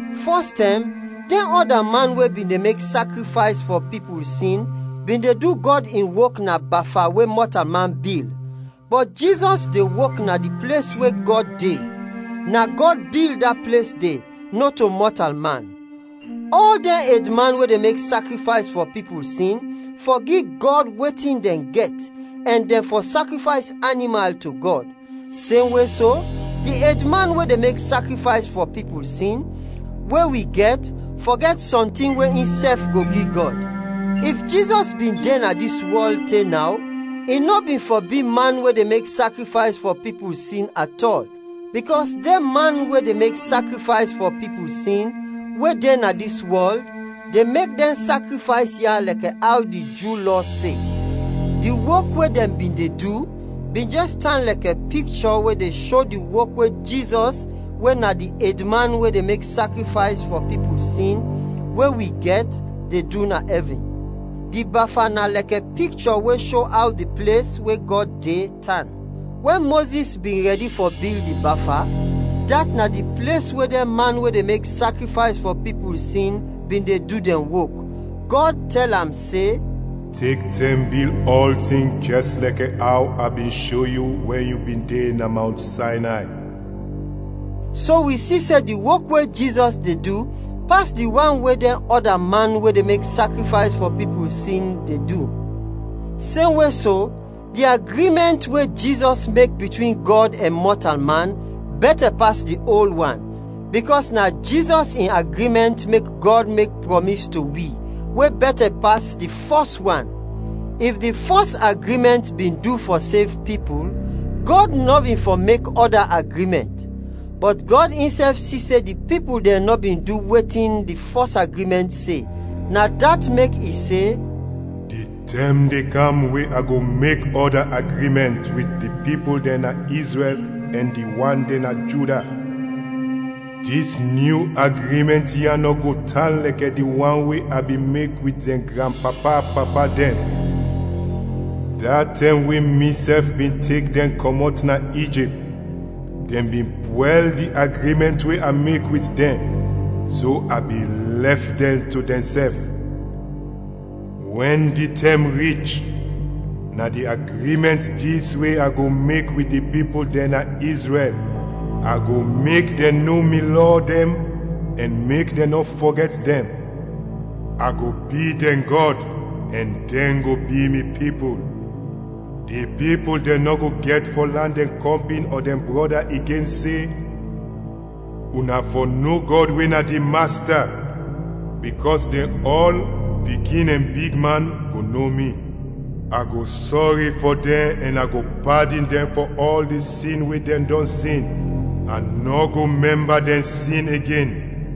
Fɔstɛm, dɛn ɔda man we bin de mek sakrifays fɔ pipul sin bin de du Gɔd in wok na bafa we mɔtalman bil, bɔt Jizɔs de wok na di ples we Gɔd de, na Gɔd bil da ples de, nɔto mɔtalman. Ɔl dɛn edman we de mek sakrifays fɔ pipul sin, fɔ gi Gɔd wetin dɛn gɛt ɛn dɛn fɔ sakrifays animal to Gɔd. Semwe so, di edman we de mek sakrifays fɔ pipul sin, we wi gɛt, fɔ gɛt sɔntin we insɛf go gi Gɔd. If Jizɔs bin de na dis wɔl te naw, i nɔ bin fɔ bi man we de mek sakrifays fɔ pipul sin atɔl, bikɔs dɛn man we de mek sakrifays fɔ pipul sin we de na dis wɔl de mek dɛn sakrifays ya lɛkɛ aw di Ju Lɔ se. Di wok we dɛn bin de du bin jɛs tan lɛkɛ pikchɔ we de sho di wok we Jizɔs we na di edman we de mek sakrifays fɔ pipul sin, we wi gɛt, de du na ɛvin. Di Bafa na lɛkɛ pikchɔ we sho aw di ples, we Gɔd de, tan. Wɛn Mozis bin rɛdi fɔ bil di Bafa, dat na di ples we dɛn man we de mek sakrifays fɔ pipul sin bin de du dɛn wok, Gɔd tɛl am se, “Tek tɛm bil ɔltin jɛs lɛkɛ aw a bin sho yu wɛn yu bin de na Mawnt Saynay.” So wi si se di wok we Jizɔs de du pas di wan we dɛn ɔda man we de mek sakrifays fɔ pipul sin de du. Semwe so, di agrimɛnt we Jizɔs mek bitwin Gɔd ɛn mɔtalman bɛtɛ pas di ol wan, bikɔs na Jizɔs in agrimɛnt mek Gɔd mek prɔmis to wi, we bɛtɛ pas di fɔs wan. If di fɔs agrimɛnt bin du fɔ sev pipul, Gɔd nɔ bin fɔ mek ɔda agrimɛnt. Bɔt Gɔd insɛf si se di pipul dɛn nɔ bin du wetin di fɔs agrimɛnt se, na dat mek i se, “Di tɛm de kam we a go mek ɔda agrimɛnt wit di pipul dɛn na Izrɛl ɛn di wan dɛn na Juda. Dis nyu agrimɛnt ya nɔ go tan lɛkɛ di wan we a bin mek wit dɛn granpapa-papa dɛn, da tɛm we misɛf bin tek dɛn kɔmɔt na Ijipt. Dɛn bin pwɛl di agrimɛnt we a mek wit dɛn, so a bin lɛf dɛn to dɛnsɛf. Wɛn di tɛm rich, na di agrimɛnt dis we a go mek wit di pipul dɛn na Izrɛl: A go mek dɛn no mi lɔ dɛn ɛn mek dɛn nɔ fɔgɛt dɛn. A go bi dɛn Gɔd, ɛn dɛn go bi mi pipul. Di pipul dɛn nɔ go gɛt fɔ lan dɛn kɔmpin ɔ dɛn brɔda igen se, ‘Una fɔ no Gɔd we na di Masta.’ Bikɔs dɛn ɔl, pikin ɛn bigman, go no mi. A go sɔri fɔ dɛn ɛn a go padin dɛn fɔ ɔl di sin we dɛn dɔn sin, a nɔ go mɛmba dɛn sin igen.”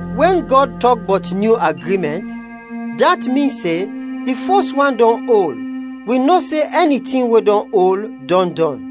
Wɛn Gɔd tɔk bɔt nyu agrimɛnt, dat min se, di fɔs wan dɔn ol. Wi no se ɛni tin we dɔn ol, dɔn dɔn.